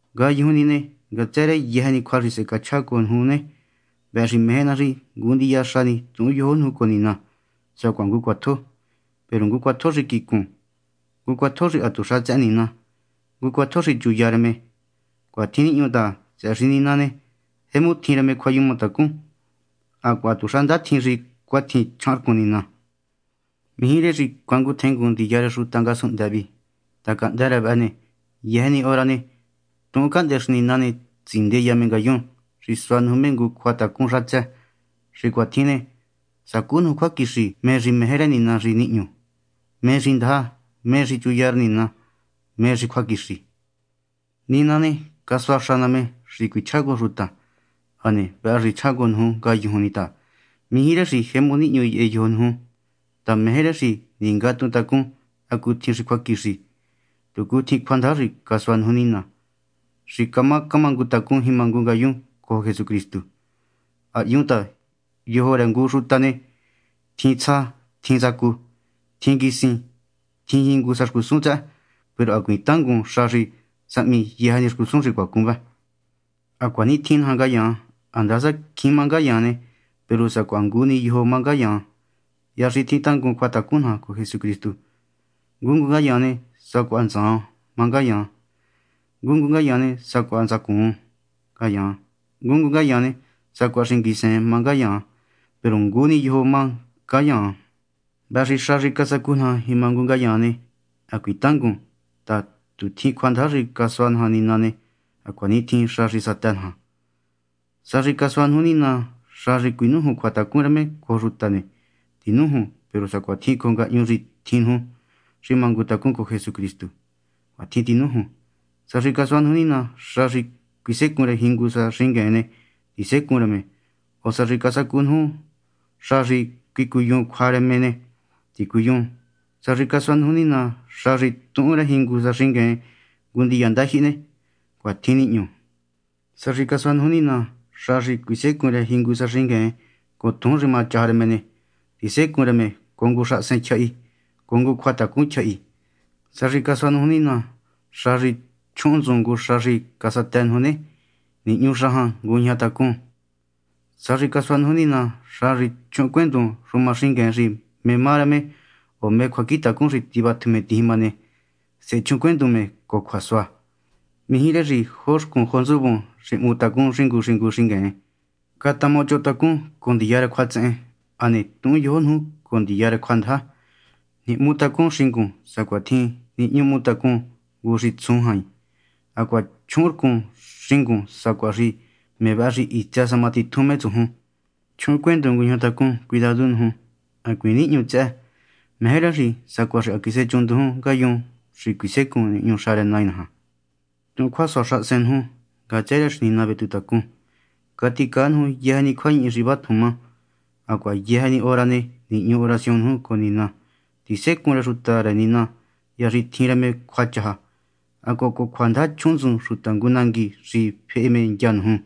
Ngayujun ni ne, ngatsë rë yëjë ni xi sehe cachjá cojo nuju ne, vëhë xi meje ná xi ngundiyaxa ni tuhun yojo nuju cojo Nina sacuaha ngu cjuatjo, peru ngu cjuatjo xi quicun, ngu cjuatjo xi hatuxa tsëhë Nina, ngu cjuatjo xi chuya rë me. Cuatjin nihñu ta, tsëhë xi Nina ne, jemu tjin rë me cjuayumatacun, hacuaha hatuxa ndatjin xi cuatjin chjahanrcun Nina. Mijí rë xi cuangun tjengun ndiya rë xuta ngasunhndë vi ta cahndë́ rë vëhë ne, yëjë ni hora ne, tuhun cahndë́ xi Nina ne, tsindeya me ngayun xi sua nuju me ngu cjuatacun xatsë. Xi cuatjin ne, sacú nuju cjuaquixi mé xi meje rë Nina xi nihñu, mé xi ndaja, mé xi chuya rë Nina, mé xi cjuaquixi. Nina ne, casuaxa ná me xi cuichjá cojo xuta. Hane vëhë xi chjá cojo nuju ngayujun ni ta, mijí rë xi jemu nihñu yehe yojo nuju ta meje rë xi ningatuhuntacun hacutjin xi cjuaquixi, tu cutjin cjuandaja xi casua nuju Nina xi camá camangutacun jima ngu ngayun cojo Jesucristu. Ha hyun ta yojo rë ngu xuta ne, tjin tsja, tjin ntsacu, tjin nguisin, tjin jingu sa xcusun tsëhë, peru hacuiin tangun xa xi sahmi yëjë xcusun xi cuacun vë. Hacuanitjin naja ngayaan, handasa cjín má ngayaan ne, peru sacuaha ngu ni yojo má ngayaan hya xi tjin tangun cjuatacun naja cojo Jesucristu. Ngu ngu ngayaan ne, sacuaha ntsan má ngayaan ne, ngu ngu ngayaan ne, sacuaha ntsacu má ngayaan, ngu ngu ngayaan ne, sacuaha nguisen má ngayaan, peru ngu ni yojo má ngayaan. Vëhë xi xa xi casacu naja jima ngu ngayaan ne, hacuiin tangun ta tu tjin cjuandaja xi casua naja Nina ne, hacuanitjin ni xa xi satë naja. Sa xi casua nuju Nina xa xi cuinújun cjuatacun rë me cojo xuta ne, tinújun, peru sacuatjin cojo ngahñu xi tjin nuju xi mangutacún cojo Jesucristu ne, cuatjin tinújun. Sa xi casua nuju Nina xa xi cuisecun rë jingusa xingueen ne, tisecun rë me. O sa xi casua nuju Nina xa xi cuicuyun cjua rë me ne, ticuyun. Sa xi casua nuju Nina xa xi tuhun rë jingu sa xingueen ngu ndiya ndajyihi ne, cuatjin nihñu. Sa xi casua nuju Nina xa xi cuisecun rë jingu sa xingueen cojo tujún xi ma chaja rë me ne, tisecun rë me cojo ngu xahasen tyjahi, cojo ngu cjuatacun tyjahi. Sa xi casua nuju Nina xa xi chjuhunntsun ngu xa xi satë nuju ne, nihñu xa jan nguñajatacun. Sa xi casua nuju Nina xa xi chjuhuncuendun xuma xingueen xi mé má rë me o mé cjuacjintacun xi tivatju me tijima ne, sehe chjuhuncuendun me cojo cjuasua. Mijí rë xi jo xcun jo ntsuvun xi nihmutacún xingu xingu xingueen. Catamachohotacun cojo ndiya rë cjuatsehen, hane tuhun yojo nuju cojo ndiya rë cjuandaja. Nihmutacun xingun sacuatjin nihñu hmu tacún tsuhun jain. Hacuaha chjuhunrcun xingun sacuaha xi me vëhë xi hitsë sa ma titjun me tsujun. Chjuhuncuendun nguñajatacun cuidadu nuju, hacuiin nihñu tsëhë. Meje rë xi sacuaha xi quisechun ngayun xi tisecuun nihñu xa rë Nai naja. Tuhun cjuasua xahasen nuju ngatsë rë xi Nina vetuhun tacun me. Caticaa nuju yëjë ni cjuañihi xi vatjun má. Hacuaha yëjë ni hora ne, nihñu oración nuju cojo Nina. Tisecun rë xuta ladu rë Nina hya xi tjin rë me cjuachaja. Hacuaha cojo cjuandaja chjuhunntsun xuta ngu nangui hya xi fehe me ndya nuju.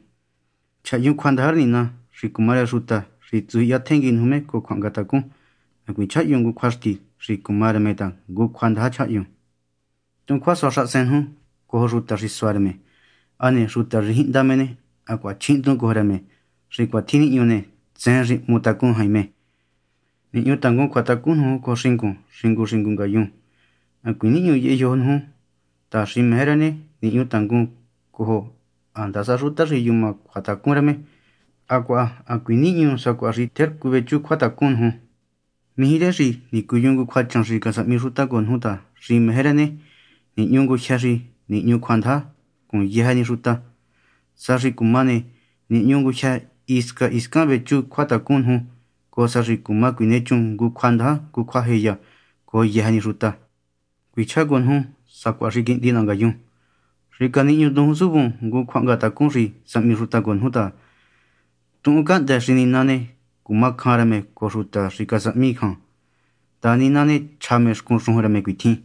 Chjahyun cjuandaja rë Nina xi cuma rë xuta xi tsujyihiyatjengui nuju me cojo cjuahngatacun. Hacuiin chjahyun ngu cjuaxti xi cuma rë me ta ngu cjuandaja chjahyun. Tuhun cjuasua xahasen nuju cojo xuta xi sua rë me, hane xuta xi jihnda me ne, hacuaha chjihndun cojo rë me. Xi cuatjin nihñu ne, tsejen xi hmutacún jain me. Nihñu tangun cjuatacun nuju cojo xingun xingu xingu ngayun. Hacuiin nihñu yehe yojo nuju ta xi meje rë ne, nihñu tangun cojo, handasa xuta xi yuma cjuatacun rë. Hacuaha hacuiin nihñu sacuaha xi jercu vechutaha cjuatacun nuju. Mijí rë xi nicuyun ngu cjuachan xi casahmi xuta cojo nuju ta xi meje rë ne, nihñu ngujyë xi nihñu cjuandaja xcun yëjë ni xuta. Sa xi cuma ne, nihñu ngujyë hisca hiscan vechu cjuatacun nuju, cojo sa xi cuma cuinechun ngu cjuandaja ngu cjuajeya cojo yëjë ni xuta. Cuichjá cojo nuju sacuaha xi quihndi naha ngayun: xicanihñundujun suvun ngu cjuahngatacun xi sahmi xuta cojo nuju ta tuhun cahndë́ xi Nina ne, cuma cjan rë me cojo xuta xi casahmi jan. Ta Nina ne, cachja me xcun xujun rë me cuitjin: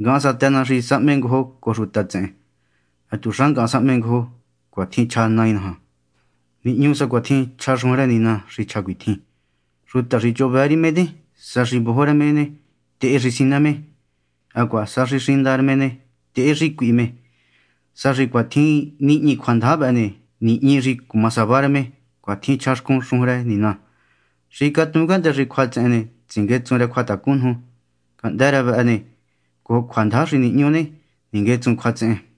“Ngahan satë ná xi sahme ngojo cojo xuta tsehen; hatuxa ngahan sahme ngojo.” Cuatjin chja Nai naja. Nihñu sacuatjin chja xujun rë Nina xi chja cuitjin: “Xuta xi choho vëë ri me ne, sa xi vojo rë me ne, tehe xi sinë me; hacuaha sa xi xinda rë me ne, tehe xi cuihi me; sa xi cuatjin nihñi cjuandaja vëhë ne, nihñi xi cuma sava rë me.” Cuatjin chja xcun xujun rë Nina. Xicatuun cahndë́ xi cjuatsehen ne, tsinguetsun rë cjuatacun nuju. Cahndë́ rë vëhë ne, cojo cjuandaja xi nihñu ne, ninguetsun cjuatsehen.